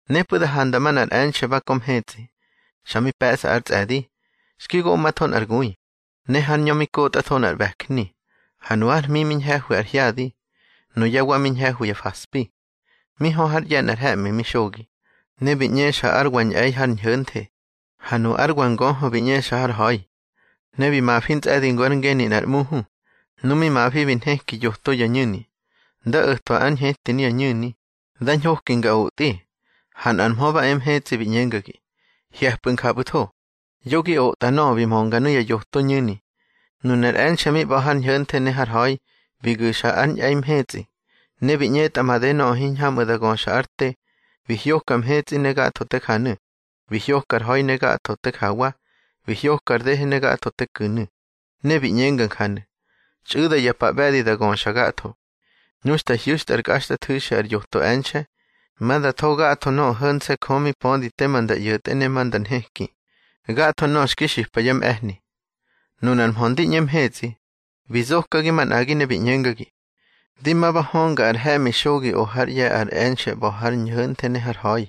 Nepꞌu̱ da handa manꞌar e̱nxe̱ ba kö mhetsꞌi, xa mi pe̱ꞌsa ár tsꞌe̱di. Xki goꞌmatho nꞌar gui, ne hár ñö mi kotꞌatho nꞌar ꞌbe̱jni. Ha nu ár hmi mi ñhe̱hwi ar hyadi, nuyá wa mi ñhe̱hwi ya faspi. Mi hö hár ꞌye̱ nꞌar he̱ꞌmi mi xogi. Ne bi ꞌñexa ár wa ñꞌe̱i har ñho̱nthe, ha nu ár wa ngöhö bi ꞌñexa har ha̱i. Ne bi mafi ntsꞌe̱di ngu ár ngeni nꞌar ꞌmuhu. Nu mi mafi bi nheki yoto ya ñu̱ni. Nda o̱twa ár ñheti nuya ñu̱ni, da ñhoki nga otꞌi, ha nꞌar mhö ba e mhetsꞌi bi ꞌñengagi: —Hye̱pꞌu̱ njapꞌu̱tho. Yo gi otꞌa nöꞌö bi mönga nuya yoto ñu̱ni. Nunar e̱nxe̱ mi ꞌba̱ har ñho̱nthe ne har ha̱i, bi gu̱xa ár ñꞌe̱i mhetsꞌi. Ne bi ꞌñetꞌa made nöꞌö hiñhamꞌu̱ da göxa ár te, bi hyoka mhetsꞌi ne gatho te janu̱, bi hyoka ar ha̱i ne gatho te jawa, bi hyoka ar dehe ne gatho te ku̱nu̱. Ne bi ꞌñenga njanu̱: —Txꞌu̱da ya pa ꞌbe̱di da göxa gatho. Nu xta hyu̱xtꞌa ár kꞌaxtꞌathu̱xi ar yoto e̱nxe̱, ma da tho gatho nöꞌö ho̱nse̱ Jö mi pödi tema nda ꞌyo̱tꞌe ne ma nda nheki, gatho nöꞌö xki xipa yá mꞌe̱hni. Nunar mhö ndi ꞌñe mhetsꞌi, bi zokagi manꞌagi ne bi ꞌñengagi: —Di ma ba hönga ar he̱ꞌmi xogi o hár ꞌye̱ ar e̱nxe̱ ꞌba̱ har ñho̱nthe ne har ha̱i.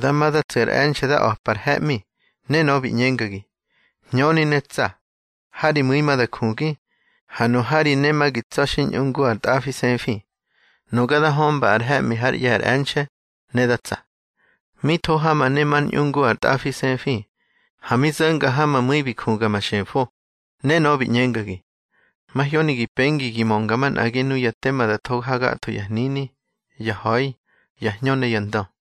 Da ma da tsu̱ ar e̱nxe̱ da a̱pa ar he̱ꞌmi, ne nöꞌö bi ꞌñengagi: —Hñöni ne tsa. Ha ri mu̱i ma da jugi, ha nu ha ri ne ma gi tsa̱ xi ñꞌu ngu ar tꞌafisefi. Nuga da hömba ar he̱ꞌmi hár ꞌye̱ ar e̱nxe̱, ne da tsa. Mi tho ha ma ne mar ñꞌu ngu ar tꞌafisefi, ha mi zo̱nga ha ma mu̱i bi juga ma xefo. Ne nöꞌö bi ꞌñengagi: —Mahyoni gi pengi gi mönga manꞌagi nuya tema da tho ha gatho ya hnini, ya ha̱i, ya hñö ne ya ndö.